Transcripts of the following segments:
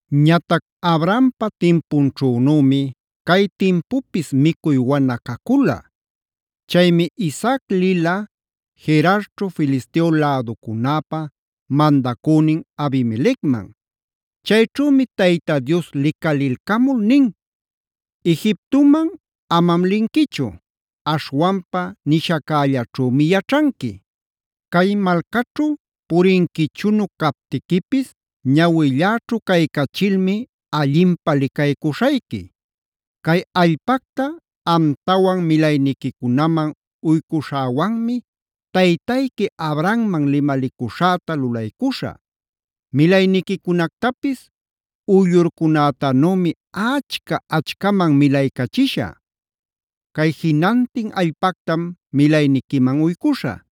Ñatac Abrahampa timpunćhünümi cay timpupis micuy wana cacula. Chaymi Isaac lila Gerarćhu Filisteo läducunäpa mandacünin Abimelecman. Chayćhümi Tayta Dios licalilcamul nin: “Egiptoman amam linquichu; aśhwanpa nishaccällaćhümi yaćhanqui. Cay malcaćhu purinquichunu captiquipis ñawilläćhu caycachilmi, allinpä licaycuśhayqui. Cay allpacta amtawan milayniquicunaman uycuśhäwanmi taytayqui Abrahamman limalicuśhäta lulaycuśhä. Milayniquicunactapis uyllurcunätanümi achca-achcaman milaycachishä. Cay jinantin allpactam milayniquiman uycuśhä.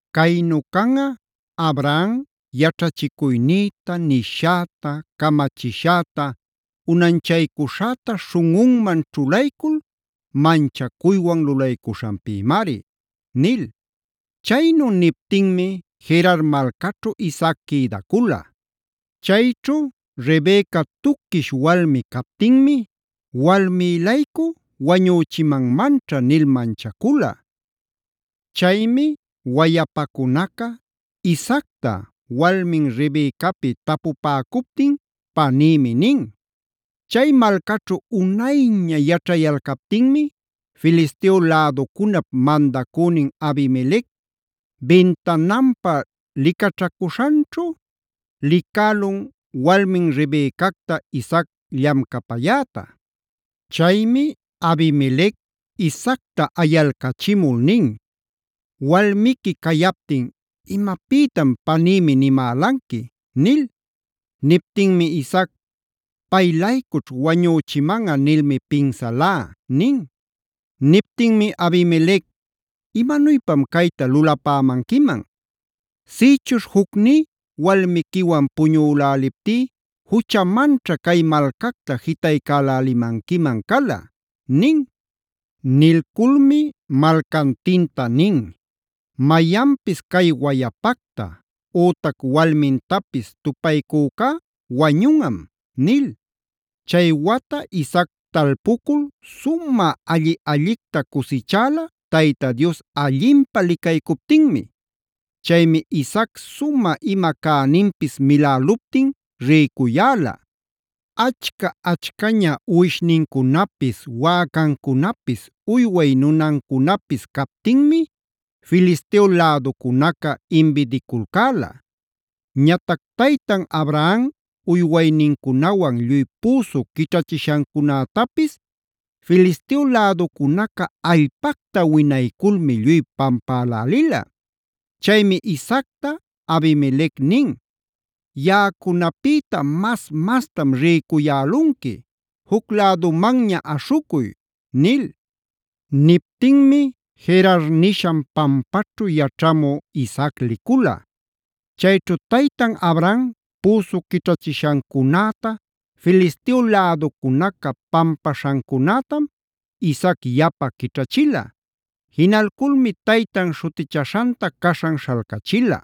Caynu canꞌa Abraham yaćhachicuynïta, nishäta, camachishäta, unanchaycuśhäta śhunꞌunman ćhulaycul manchacuywan lulaycuśhanpïmari” nil. Chaynu niptinmi Gerar malcaćhu Isaac quïdacula. Chayćhu Rebeca tuquish walmi captinmi “walmí-laycu wañüchimanmanćha” nil manchacula. Chaymi wayapacunaca Isaacta walmin Rebecapi tapupäcuptin “panïmi” nin. Chay malcaćhu unayña yaćhayalcaptinmi Filisteo läducunap mandacünin Abimelec bintananpa licaćhacuśhanćhu licälun walmin Rebecacta Isaac llamcapayäta. Chaymi Abimelec Isaacta ayalcachimul nin: “Walmiqui cayaptin ¿imapïtam ‘panïmi’ nimälanqui?” nil. Niptinmi Isaac: “Pay-laycućh wañüchimanꞌa nilmi pinsalá” nin. Niptinmi Abimelec: “Imanuypam cayta lulapämanquiman. Sïchuśh jucní walmiquiwan puñüläliptí, juchamanćha cay malcacta jitaycalälimanquiman cala” nin. Nilculmi malcantinta nin: “Mayanpis cay wayapacta ütac walmintapis tupaycücá wañunꞌam” nil. Chay wata Isaac talpucul sumä alli-allicta cusichäla Tayta Dios allinpä licaycuptinmi. Chaymi Isaac sumä ima cäninpis miläluptin rïcuyäla. Achca achcaña uwishnincunapis, wäcancunapis, uyway nunancunapis captinmi Filisteo läducunaca imbidiculcäla. Ñatac taytan Abraham uywaynincunawan lluy püsu quićhachishancunätapis, Filisteo läducunaca allpacta winayculmi lluy pampälälila. Chaymi Isaacta Abimelec nin: “Yaꞌacunapïta mas mastam rïcuyälunqui, juc lädumanña aśhucuy” nil. Niptinmi Gerar nishan pampaćhu yaćhamü Isaac licula. Chayćhu taytan Abraham püsu quićhachishancunäta Filisteo läducunaca pampaśhancunätam Isaac yapa quićhachila. Jinalculmi taytan śhutichaśhanta caśhan śhalcachila.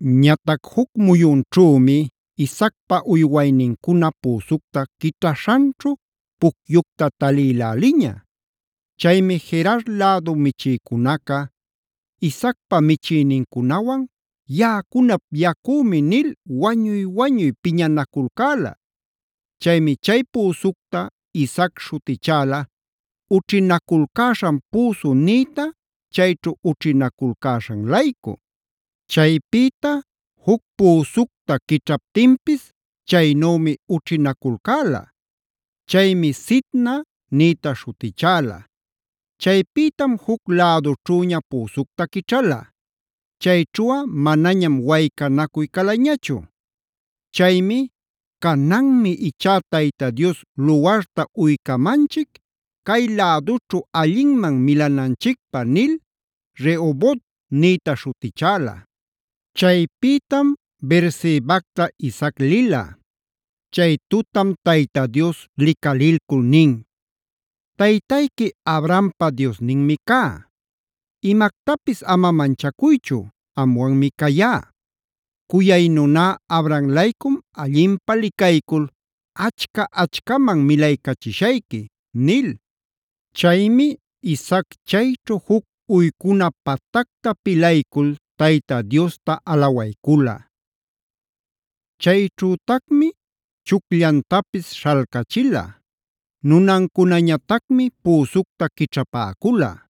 Ñatac juc muyunćhümi Isaacpa uywaynincuna püsucta quićhaśhanćhu pucyucta talïläliña. Chaymi Gerar lädu michïcunaca Isaacpa michïnincunawan “yaꞌacunap yacümi” nil wañuy-wañuy piñanaculcäla. Chaymi chay püsucta Isaac śhutichäla “ućhinaculcäśhan püsu” nïta, chayćhu ućhinaculcäśhan-laycu. Chaypïta juc püsucta quićhaptinpis, chaynümi ućhinaculcäla. Chaymi “Sitna”b nïta śhutichäla. Chaypïtam juc lädućhüña püsucta quićhala. Chayćhuꞌa manañam waycanacuy calañachu. Chaymi “Cananmi ichá Tayta Dios luwarta uycamanchic cay lädućhu allinman milananchicpä” nil “Rehobot”c nïta śhutichäla. Chaypïtam Beersebacta Isaac lila. Chay tutam Tayta Dios licalilcul nin: “Taytayqui Abrahampa Diosninmi cá; Imactapis ama manchacuychu, amwanmi cayá. Cuyay nuná Abraham-laycum allinpä licaycul achca-achcaman milaycachishayqui” nil. Chaymi Isaac chayćhu juc uycuna patacta pilaycul Tayta Diosta alawaycula. Chayćhütacmi chucllantapis śhalcachila; nunancunañatacmi püsucta quićhapäcula.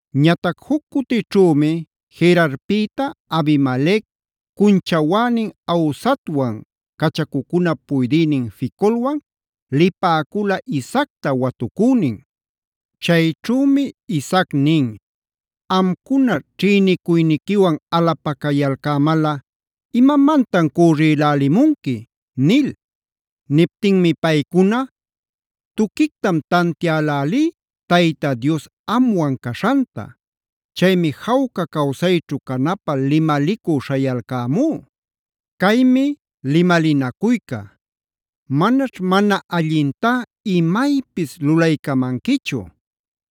Ñatac juc cutićhümi Gerarpïta Abimelec,d cunchawänin Ahuzatwan, cachacuncunap puydïnin Ficolwan lipäcula Isaacta watucünin. Chayćhümi Isaac nin: “Amcuna ćhïnicuyniquiwan alapacayalcämalꞌa ¿imamantan cürrilälimunqui?” nil. Niptinmi paycuna: “Tuquictam tantiälälí Tayta Dios amwan caśhanta. Chaymi jawca cawsayćhu canapä limalicü śhayalcämú. Caymi limalinacuyca: ‘Manaćh mana allintá imaypis lulaycamanquichu.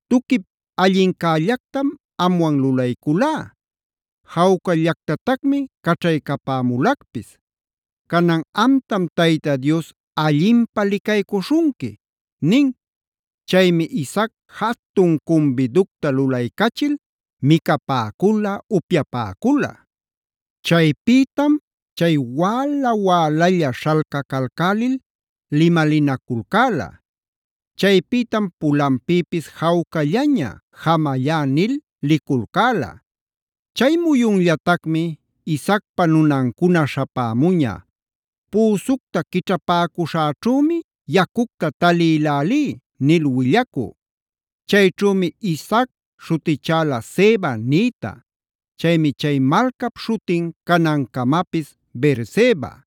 Tuquip allincällactam amwan lulayculá, jawcallactatacmi caćhaycapämulacpis. Canan amtam Tayta Dios allinpä licaycuśhunqui’” nin. Chaymi Isaac jatun cumbiducta lulaycachil micapäcula, upyapäcula. Chaypïtam chay wäla-wälalla śhalcacalcälil limalinaculcäla. Chaypïtam pulanpïpis jawcallaña “jamallá” nil liculcäla. Chay muyunllatacmi Isaacpa nunancuna śhapämuña: “Püsucta quićhapäcüśhäćhümi yacucta talïlälí” nil willacü. Chayćhümi Isaac śhutichäla “Seba”e nïta. Chaymi chay malcap śhutin canancamapis Beerseba.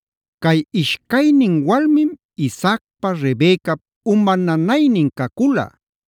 Cay ishcaynin walmim Isaacpa Rebecap uma nanaynin cacula.